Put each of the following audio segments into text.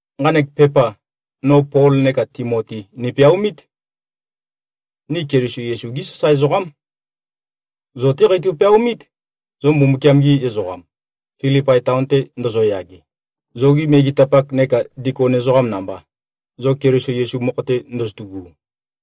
Nqanek pepa, no Pol neka Timoti nipeaomít. Ni Keliso Yesu-gí sasae ezoqám. Zo-té qeitø-peaomít, zo Mbumbukiam-gi ezoqam, Filipai taon-te ndozoyage, zogi megetapak neka dikon ezoqam namba, zo Keliso Yesu mokho-te ndozotu꞉gu.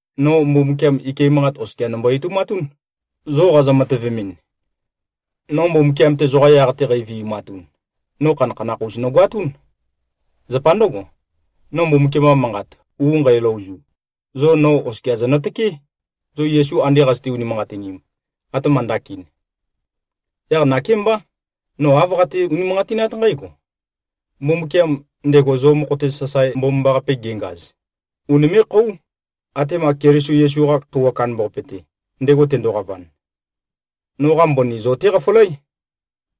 No Mbumbukiam, ike manqat oskia nombo-etoumatún, zo qazø-matøvemɨn. No Mbumbukiam-te zoqa yaq-te qævi꞉matun, no khanakhanakh-us nogoatún. Zapa ndǿgo, no Mbumbukiam-qa Manqat u nqæløozu, zo no oskia zonøtøkeé, zo Yesu ande qazøte-unimanqatinim, atema ndakin. Yaq nakémbá, no āv qate-unimanqatinát nqǽgo: Mbumbukiam, ndego zo mokho-te sasae mbomambaqape gengaz, unimé꞉-khóu, atema Keliso Yesu-qa Khøuwa Kandambaqape-te, ndego tendoqavan. Noqa mbøni zo-té qafølǽ.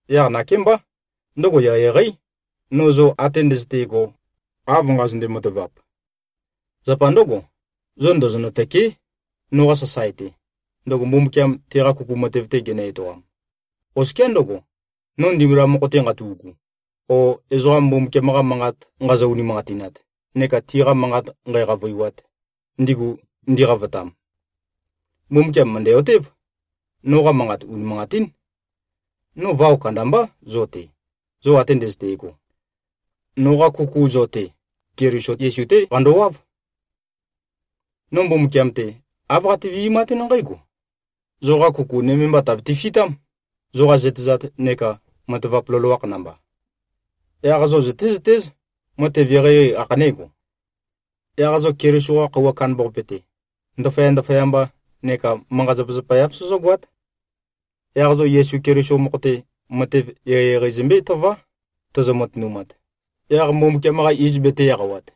Yaq nakémbá, ndøgo eqeieqeí, no zo ate ndøzøte꞉go, av nqazønde-matavap. Zapa ndǿgo, zo ndozonø-tø̂keé noqa sasae-te, ndøgo Mbumbukiam teqa kuku matev-te genø-etoam, oskiá ndøgo, no ndimbula mokho-te nqatu꞉gu, o ezoqam Mbumbukiam-qa Manqat nqazø-unimanqatinat neka tiqa manqat nqæqavøiwat, ndigu ndiqavotam. Mbumbukiam mø̀ndæ-otév, noqa manqat unimanqatín. No vao kandambá zo-te, zo ate ndøzøte꞉go. Noqa kuku zo-te, Keliso Yesu-té qandowáv. No Mbumbukiam-te, āv qate-vi꞉matún nqǽgo: Zoqa kuku nøme mba, tàbete-fitám, zoqa zøtezat neka matavap loloakh namba. Yaq zo zøtézøtéz, matev eqeieqei ākhanégo. Yaq zo Keliso-qa Khøuwa Kandambaqape-te, ndaføya-ndaføyamba neka manqa-zapazapa-yav sozógoát. Yaq zo Yesu Keliso mokho-te, matev eqeieqei zømbé-tøvá, tozo-matønumat, yaq Mbumbukiam-qa iz betē-eqawat.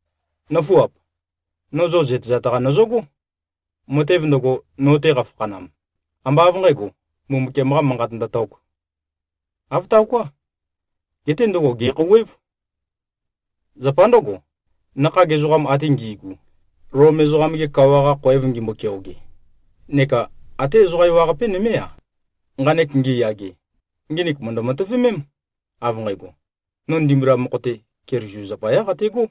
Nǿfuap! No zo zøtezat-qa nøzøgó. Matev ndøgo, no-te qafakhanam, ambá av nqǣgo, Mbumbukiam-qa Manqat ndøtōk. Āv taoká. Geté ndøgo, gè꞉khouwév. Zapa ndǿgo, nakhag ezoqam ate ngi꞉gu, Lom ezoqam-ge kawa-qa khoev ngimbo-keoge, neka até ezoqa ewaqape nømé-a, nqanek ngiyage, nginik mø̀ndø-matøvemém, av nqægo, no ndimbula mokho-te, Keliso zapayá qategó.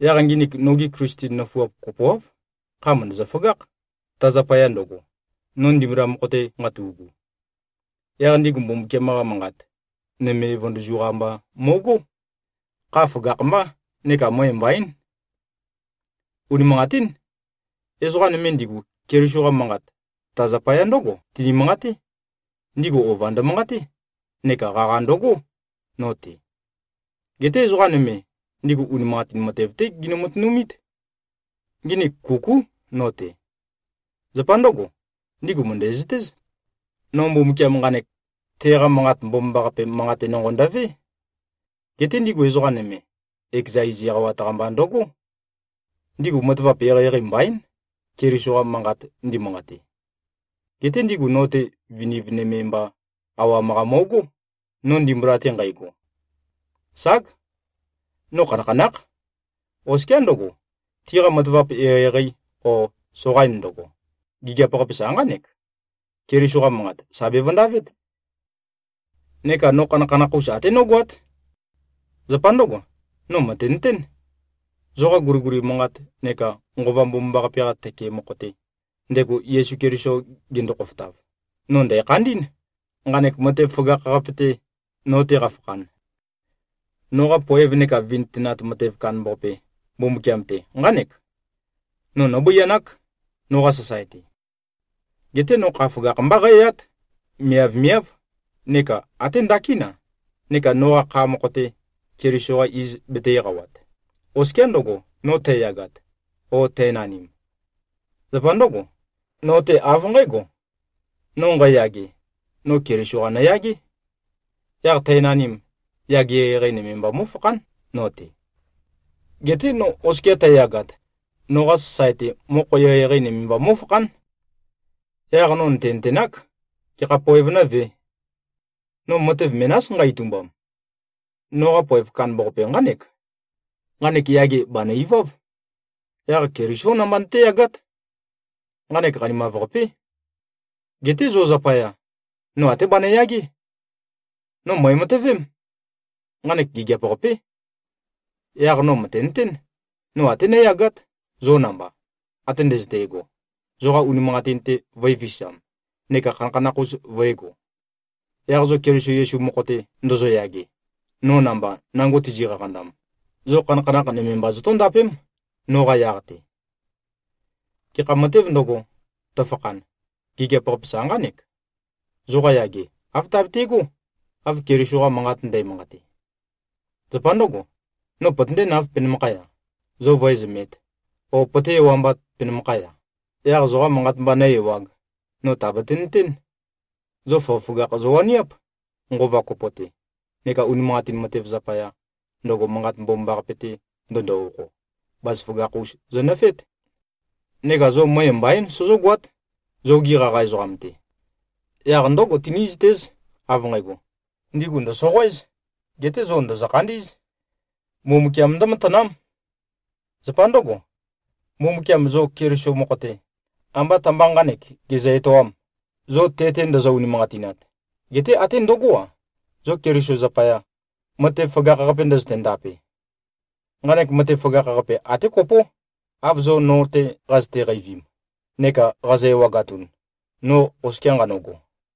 Yaq nginik nogi Klisten nøfuap kopoáv, kha mø̀ndøzø-føgákh, ta zapaya ndøgo, no ndimbula mokho-te nqatu꞉gu. Yaq ndigu Mbumbukiam-qa Manqat, nøme vøndøzu-qa mba mo꞉gó. Kha føgakh-mbá neka møe mbaín. Unimanqatín. Ezoqa nøme ndigu Keliso-qa manqat, ta zapaya ndǿgo tini-manqaté: Ndigu ova ndømanqaté neka qaqa ndøgó, no-te. Geté ezoqa nøme, ndigu unimanqatin matev-té ginø-matønumít. Nginik kukú no-te. Zapa ndǿgo, ndigu mø̀ndæzøtéz, no Mbumbukiam nqanek, teqa Manqat Mbomambaqape manqate nonqo ndøvé. Geté ndigu ezoqa nøme, ekeza iz eqawat-qa mba ndøgó. Ndigu matavap eqeieqei mbaín, Keliso-qa manqat ndimanqate. Geté ndigu no-te viniv nøme mba awam-qa mo꞉gó, no ndimbula-te nqægo. Ság. No khanakhanákh. Oskiá ndøgo, tiqa matavap eqeieqei o soqain ndøgo, gigiap-qape sa nqánek: Keliso-qa manqat, sà bevøndavét. Neka no khanakhanakh-us até nógoát. Zapa ndǿgo, no mø̀tenøtén: Zoqa guliguli manqat neka Nqova Mbomambaqape-qa tøke mokho-te, ndego Yesu Keliso gendo-khofotav, no ndæ̀khandí꞉n, nqanek matev føgakh-qape-te, no-te qafakhan. Noqa poev neka vintønat matev kandambaqape, Mbumbukiam-te, nqánek: No nóbøianák, noqa sasae-te. Geté no kha føgakh-mbá qǽyát, miavmiáv neka até ndakín-a, neka noqa kha mokho-te, Keliso-qa iz betē-eqawat, oskiá ndøgo, no tæyàgāt, ō, tænanim. Zapa ndǿgo, no-te av nqǽgo: No nqæyage, no Keliso-qa nøyagé. Yaq tænanim, yage eqeieqei nøme mba mó꞉fakhán no-te. Geté no oskia tæyagat, noqa sasae-te mokho eqeieqei nøme mba mó꞉fakhán. Yaq no nø̀tenøtenák, gekha poev nǿvē. No matev menás, nqa-itumbam. Noqa poev kandambaqape nqánek: Nqanek yage bànø-iváv. Yaq Kelisó namba nøtéyagát. Nqanek qanimav-qapé. Geté zo zapaya, no até banøyagé. No mø̀ematøvém. Nqanek gigiap-qapé. Yaq no mø̀tenøtén, no até nǿyagát, zo namba, ate ndøzøte꞉go, zoqa unimanqatin-te vø̄efisam neka khanakhanakh-us vø̄ego. Yaq zo Keliso Yesu mokho-te ndozoyage, no namba nango tizi-qaqandam, zo khanakhanakh nøme mba zotóndapém, noqa yaq-te. Gekha matēv ndøgo, tøfakhan, gigiap-qape sa nqánek: Zoqa yage, āv tabete꞉gó, av Keliso-qa Manqat ndæmanqate. Zapa ndǿgo, no pøtøndénāv, penømakhaya, zo vǿezømēt, o pøté-ewambāt, penømakhaya, yaq zoqa manqat mba nǿ-ewāg, no tàbate-nøtén: Zo føgøføgakh zowaniáp, nqova kopo-te, neka unimanqatin matev zapaya, ndøgo Manqat Mbomambaqape-te ndøndo-okho, bazaføgakh-us zonøfeét. Neka zo møe mbaín sozógoát, zogi qaqa ezoqam-te. Yaq ndǿgo, tinízøtéz, av nqægo, ndigu ndø̀soqoéz, geté zo ndòzo-khandí꞉z. Mbumbukiam ndǿmatanám. Zapa ndǿgo, Mbumbukiam zo Keliso mokho-te, ambá ta-mba nqānek gezø-etoām, zo te-te ndozo-unimanqatinat, geté até ndøgó-a, zo Keliso zapaya, matev føgakh-qape ndøzøte-ndape. Nqanek matev føgakh-qape, até kopó, av zo no-te qazøte-qeivim, neka qazo-ewagatun, no oskia nqanøgo.